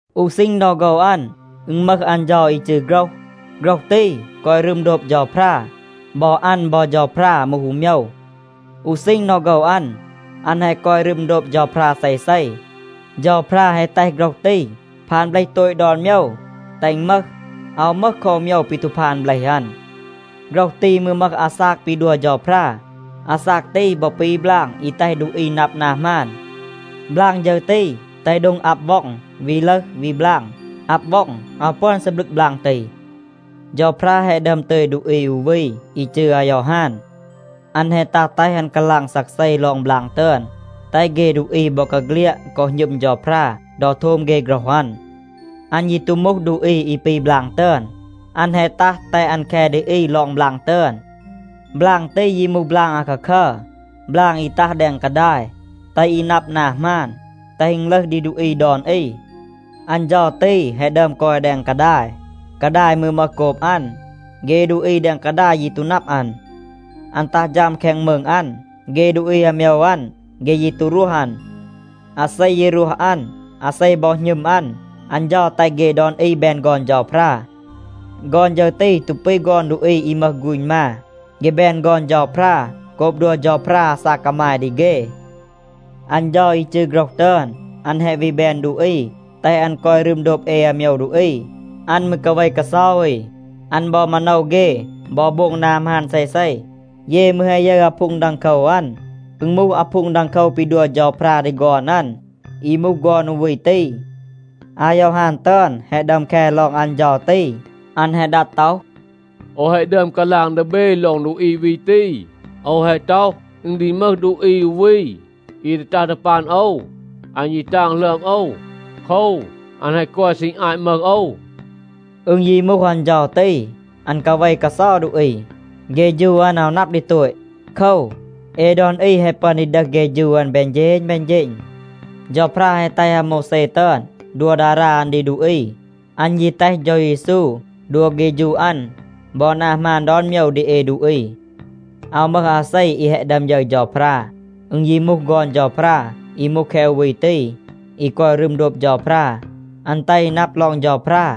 อู ซีณ ดอ โฆว อัน, อึณ มึห อัน เฌา อี จืร “โฆรห.” โฆรห ตี กอย รึม โดบ เฌาพรา. บอ อัน บอ เฌาพรา มูห อู โมยว. อู ซีณ ดอ โฆว อัน, อัน แฮะ กอย รึม โดบ เฌาพรา เซเซ. เฌาพรา แฮะ แตห โฆรห ตี พาน เบลห โตต ดอน โมยว, แตห อึณ มึห. อาว มึห คอ อู โมยว ปี ตู พาน เบลห อัน. โฆรห ตี มืร มึห อาซาก ปี ดัว เฌาพรา. อาซาก ตี บอ ปี บลาง อี แตห ดูอี นับ นา หมาน. บลาง ฌึร ตี แตห โดง อับ ว็อง วี ลึห วี บลาง. อับ ว็อง อาว ปึอน ซีบลึก บลาง ตี. เฌาพรา แฮะ ดึอม ตึย ดูอี อู วี อี จืร อายอฮาน. อัน แฮะ ตัห แตห อัน กาลาง ซักเซ ลอง บลาง ตึอน, แตห เฆ ดูอี บอกาเฆลียด กอ หณึม เฌาพรา ดอ โทม เฆ โฆรห อัน. อัน ยี ตู มูห ดูอี อี ปี บลาง ตึอน, อัน แฮะ ตัห แตห อัน แค ดี อี ลอง บลาง ตึอน. บลาง ตี ยี มูห บลาง อาคาคัร, บลาง อี ตัห แดง กาดาย, แตห อี นับ นา หมาน, แตห อึณ ลึห ดี ดูอี ดอน อี. อัน เฌา ตี แฮะ ดึอม กอย แดง กาดาย. กาดาย มืร มึห โกบ อัน. เฆ ดูอี แดง กาดาย ยี ตู นับ อัน. อัน ตัห ฌัม แคง มืง อัน. เฆ ดูอี อาโมยว อัน, เฆ ยี ตู รวห อัน. อาเซ ยี รวห อัน, อาเซ บอ หณึม อัน, อัน เฌา แตห เฆ ดอน อี แบน ฆอน เฌาพรา. ฆอน ฌึร ตี ตู ปี ฆอน ดูอี อี มึห ฆูณ มา. เฆ แบน ฆอน เฌาพรา โกบ ดัว เฌาพรา อาซาก กามาย ดี เฆ. อัน เฌา อี จืร “โฆรห” ตึอน, อัน แฮะ วี แบน ดูอี, แตห อัน กอย รึม โดบ เอ อาโมยว ดูอี. อัน มืร กาเว กาเซา อี. อัน บอ มาโนว เฆ บอ โบง นา หมาน เซเซ. เย มืร แฮะ ยึร อาพูง ดังโคว อัน. อึณ มูห อาพูง ดังโคว ปี ดัว เฌาพรา ดี ฆอน อัน, อี มูห ฆอน อู วี ตี. อายอฮาน ตึอน แฮะ ดึอม แค ลอง อัน เฌา ตี. อัน แฮะ ดัด ต็อห, “โอว แฮะ ดึอม กาลาง ดี เบ ลอง ดูอี วี ตี. โอว แฮะ ต็อห, อึณ ดี มึห ดูอี อู วี อี ดี ตัห ดี ปัน โอว. อัน ยี ตาง หลึอม โอว. โคว, อัน แฮะ กอย ซีณ อาต มึห โอว.” อึณ ยี มูห อัน เฌา ตี, อัน กาเว กาเซา ดูอี. เฆฌู อัน อาว นับ ดี โตต. โคว, เอ ดอน อี แฮะ ปึอน ดี ดึห เฆฌู อัน แบน เฌณ แบน เฌณ. เฌาพรา แฮะ แตห อาโมวแซ ตึอน ดัว ดารา อัน ดี ดูอี. อัน ยี แตห เฌา เยซู ดัว เฆฌู อัน บอ นา หมาน ดอน โมยว ดี เอ ดูอี. อาว มึห อาเซ อี แฮะ ดึอม ยึร เฌาพรา. อึณ ยี มูห ฆอน เฌาพรา, อี มูห แคะ อู วี ตี, อี กอย รึม โดบ เฌาพรา. อัน แตห อี นับ ลอง เฌาพรา.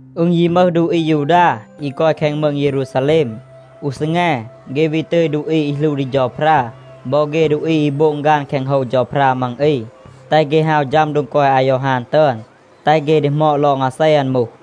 อึณ ยี มึห ดูอี อายูดา อี กอย แคง มืง เยรูซาแลม. อู ซีแง เฆ วี ตึย ดูอี อี หลู ดี เฌาพรา บอ เฆ ดูอี อี โบง ฆาน แคง โฮว เฌาพรา มัง อี, แตห เฆ ฮาว ฌัม โดง กอย อายอฮาน ตึอน, แตห เฆ ดีหมอด ลอง อาเซ อัน มูห.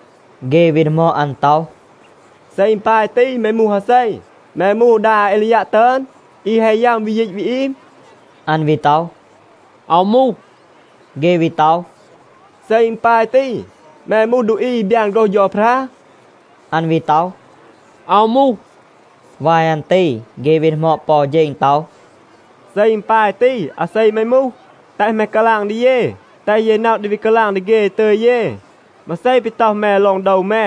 เฆ วี ดีหมอด อัน ต็อห, “เซ อึณ ปาย ตี, แม มูห อาเซ? แม มูห ดา อาเอลียัะ ตึอน, อี แฮะ ยัม, วี ยีต วี อีม?” อัน วี ต็อห, “อาว มูห.” เฆ วี ต็อห, “เซ อึณ ปาย ตี, แม มูห ดูอี อี บยาน โฆรห เฌาพรา?” อัน วี ต็อห, “อาว มูห.” วาย อัน ตี เฆ วี ดีหมอด ปอ เฌณ ต็อห, “เซ อึณ ปาย ตี, อาเซ แม มูห? แตห แม กาลาง ดี เย, แตห เย นับ ดี วี กาลาง ดี เฆ อี ตึย เย. มาเซ ปี ต็อห แม ลอง โดว แม?”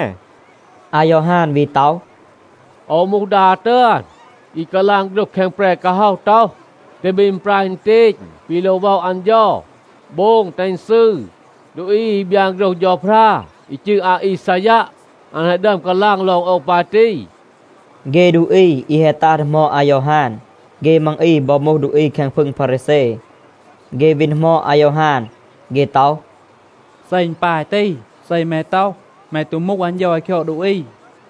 อายอฮาน วี ต็อห, “โอว มูห ดา ตึอน, อี กาลาง โฆรห แคง แปร กาฮ็อห ต็อห, ‘แตห เบ อึณปราย อึณเตณ ปี โลว ว็อะ อัน เฌา. โบง, แตห อึณ ซืร.’ ดูอี อี บยาน โฆรห เฌาพรา อี จืร อาอีซายัะ, อัน แฮะ ดึอม กาลาง ลอง โอว ปาย ตี.” เฆ ดูอี อี แฮะ ตัห ดีหมอด อายอฮาน, เฆ มัง อี บอ มูห ดูอี แคง พึง พารีแซ. เฆ วี ดีหมอด อายอฮาน. เฆ ต็อห, “เซ อึณ ปาย ตี, เซ แม ต็อห, แม ตู มูห อัน เฌา อี คยอด ดูอี,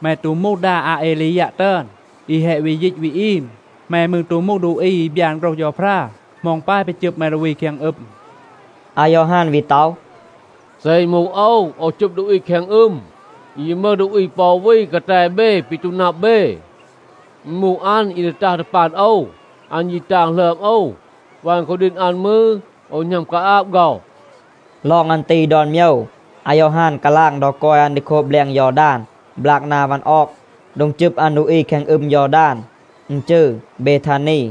แม ตู มูห ดา อาเอลียัะ ตึอน, อี แฮะ วี ยีต วี อีม, แม มืร ตู มูห ดูอี อี บยาน โฆรห เฌาพรา, เหมา อึณ ปาย ปี จึบ แม ดูอี แคง อึม?” อายอฮาน วี ต็อห, “เซ อึณ มูห โอว, โอว จึบ ดูอี แคง อึม. อึณ ยี มึห ดูอี ปอ อู วี กาแต เบ ปี ตู นับ เบ. อึณ มูห อัน อี ดี ตัห ดี ปัน โอว. อัน ยี ตาง หลึอม โอว. วัน คูดีณ อัน มืร, โอว หณัม กาอาบ ฆ็อห.” ลอง อัน ตี ดอน โมยว อายอฮาน กาลาง ดอ กอย อัน ดี โคบ แบลง ยอดาน บลาก นา วัน ออก. โดง จึบ อัน ดูอี แคง อึม ยอดาน, อึณ จืร เบทานี.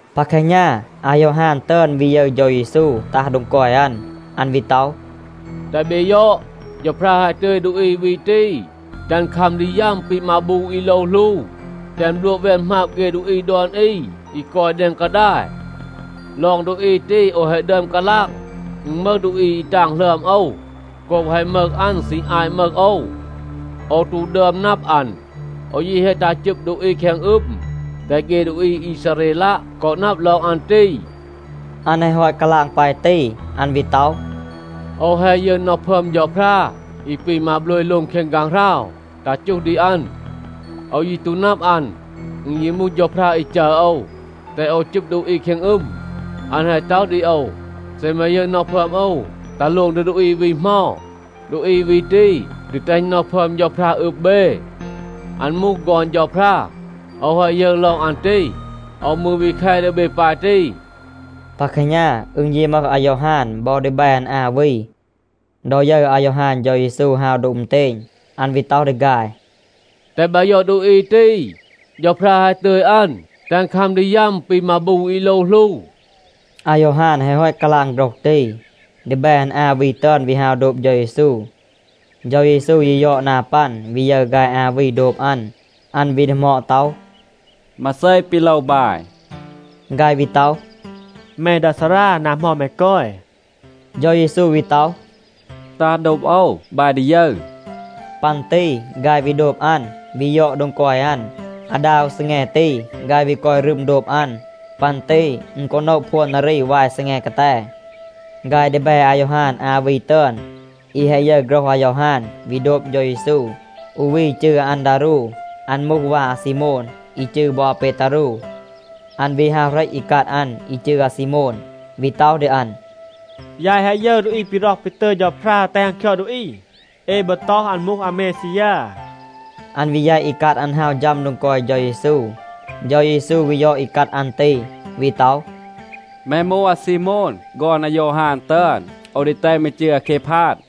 ปา แคหณา อายอฮาน ตึอน วี ยึร เฌา เยซู ตัห โดง กอย อัน. อัน วี ต็อห, “แตห เบ ยอด, เฌาพรา แฮะ ตึย ดูอี วี ตี, แตห อัน คัม ดี ยัม ปี มาบู อี โลว หลู, แตห อัน บลัวะ แวน หมาบ เฆ ดูอี ดอน อี อี กอย แดง กาดาย. ลอง ดูอี ตี โอว แฮะ ดึอม กาลาง, อึณ มึห ดูอี อี ตาง หลึอม โอว โกบ แฮะ มึห อัน ซีณ อาต มึห โอว. โอว ตู ดึอม นับ อัน. โอว ยี แฮะ ตัห จึบ ดูอี แคง อึม, แตห เฆ ดูอี อีซาเรลัะ กอ นับ ลอง อัน ตี.” อัน แฮะ ฮอต กาลาง ปาย ตี, อัน วี ต็อห, “โอว แฮะ ยึร น็อห พึอม เฌาพรา อี ปี มาโบลย โลง แคง ฆางหราว, ตัห จูห ดี อัน. โอว ยี ตู นับ อัน. อึณ ยี มูห เฌาพรา อี จัร โอว, แตห โอว จึบ ดูอี แคง อึม, อัน แฮะ ต็อห ดี โอว, ‘เซ แม ยึร น็อห พึอม โอว ตัห โลง ดี ดูอี วี เหมา, ดูอี วี ตี ดี แตห น็อห พึอม เฌาพรา อึบ เบ. อัน มูห ฆอน เฌาพรา.’ โอว แฮะ ยึร ลอง อัน ตี. โอว มืร วี แค ดี เบ ปาย ตี.” ปา แคหณา อึณ ยี มึห อายอฮาน บอ ดีแบ อัน อา วี. ดอ ยึร อายอฮาน เฌา เยซู ฮาว โดบ อึณเตณ, อัน วี ต็อห ดี ฆาย, “แตห บาย ยอด ดูอี ตี. เฌาพรา แฮะ ตึย อัน, แตห อัน คัม ดี ยัม ปี มาบู อี โลว หลู.” อายอฮาน แฮะ ฮอต กาลาง โฆรห ตี, ดีแบ อัน อา วี ตึอน วี ฮาว โดบ เฌา เยซู. เฌา เยซู ยี ยอด นา ปัน, วี ยึร ฆาย อา วี โดบ อัน. อัน วี ดีหมอด ต็อห, “มาเซ ปี โลว บาย?” ฆาย วี ต็อห, “แม ดา ซารา, นา เหมา แม กอย?” เฌา เยซู วี ต็อห, “ตัห โดบ โอว. บาย ดี ยึร.” ปัน ตี ฆาย วี โดบ อัน, วี ยอด โดง กอย อัน. อาดา อู ซีแง ตี ฆาย วี กอย รึม โดบ อัน. ปัน ตี อึณ กอ โนะ พวน นารี วาย ซีแง กาแต. ฆาย ดีแบ อายอฮาน อา วี ตึอน, อี แฮะ ยึร โฆรห อายอฮาน, วี โดบ เฌา เยซู, อู วี จืร อาอันดารู. อัน มูห วา อาซีโมน, อี จืร บอ อาเปตารู. อัน วี ฮาว เหรต อีกัด อัน อี จืร อาซีโมน, วี ต็อห ดี อัน, “ยาย แฮะ ยึร ดูอี ปี ร็อห ปี ตึย เฌาพรา แตห อัน คยอด ดูอี. เอ บอ ต็อห อัน มูห อาเมซียา.”a อัน วี แยต อีกัด อัน ฮาว ฌัม โดง กอย เฌา เยซู. เฌา เยซู วี ยอด อีกัด อัน ตี, วี ต็อห, “แม มูห อาซีโมน, ฆอน อายอฮาน ตึอน. โอว ดี แตห แม จืร อาเคพาด.”b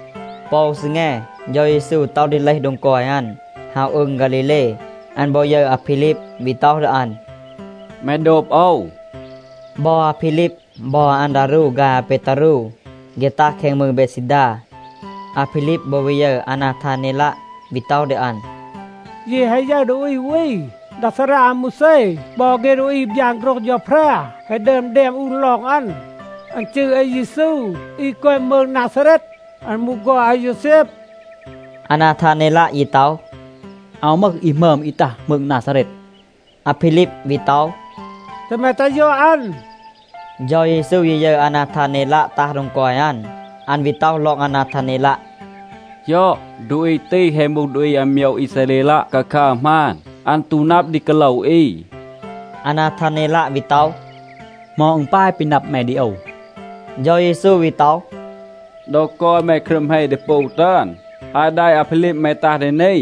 ปอ อู ซีแง เฌา เยซู ต็อห ดี เลห โดง กอย อัน, ฮาว อืง ฆาลีเล. อัน บอ ยึร อาพีลีบ, วี ต็อห ดี อัน, “แม โดบ โอว.” บอ อาพีลีบ บอ อาอันดารู ฆาย อาเปตารู, เฆ ตัห แคง มืง เบดซีดา. อาพีลีบ บอ วี ยึร อานาทาเนลัะ, วี ต็อห ดี อัน, “เย แฮะ ยึร ดูอี อู วี. ดา ซารา อาโมวแซ บอ เฆ ดูอี อี บยาน โฆรห เฌาพรา แฮะ ดึอม แดม อูน ลอง อัน. อัน จืร อาเยซู อี กอย มืง นาซาเรต. อัน มูห ฆอน อาโยวแซบ.” อานาทาเนลัะ ยี ต็อห, “อาว มึห อี หมึอม อี ตัห มืง นาซาเรต.” อาพีลีบ วี ต็อห, “แตห แม ตัห ยอด อัน.” เฌา เยซู ยี ยึร อานาทาเนลัะ ตัห โดง กอย อัน, อัน วี ต็อห ลอง อานาทาเนลัะ, “ยอด, ดูอี ตี แฮะ มูห ดูอี อาโมยว อีซาเรลัะ คาคัร หมาน. อัน ตู นับ ดี กาโลว อี.” อานาทาเนลัะ วี ต็อห, “เหมา อึณ ปาย ปี นับ แม ดี โอว?” เฌา เยซู วี ต็อห, “ดอ กอย แม ครึม เฮ ดีปู ตึอน, อาต แดะ อาพีลีบ แม ตัห ดี นี,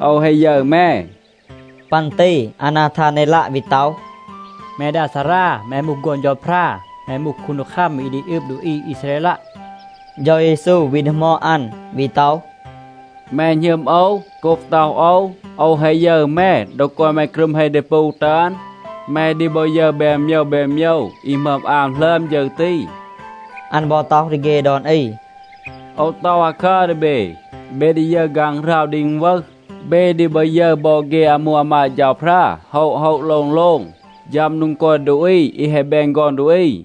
โอว แฮะ ยึร แม.” ปัน ตี อานาทาเนลัะ วี ต็อห, “แม ดา ซารา, แม มูห ฆอน เฌาพรา, แม มูห คูนดีคัม อี ดี อึบ ดูอี อีซาเรลัะ.” เฌา เยซู วี ดีหมอด อัน วี ต็อห, “แม หณึม โอว, โกบ ต็อห โอว, โอว แฮะ ยึร แม ดอ กอย แม ครึม เฮ ดีปู ตึอน? แม ดี บอ ยึร แบน โมยว แบน โมยว อี หมึอม อาม หลึอม ฌึร ตี.” อัน บอ ต็อห ดี เฆ ดอน อี, “โอว ต็อห อาคัร ดี เบ. เบ ดี ยึร ฆางหราว ดี อึณวึห. เบ ดี บอ ยึร บอ เฆ อามู อามาด เฌาพรา โฮะ โฮะ, โลง โลง, ฌัม โดง กอย ดูอี อี แฮะ แบน ฆอน ดูอี.”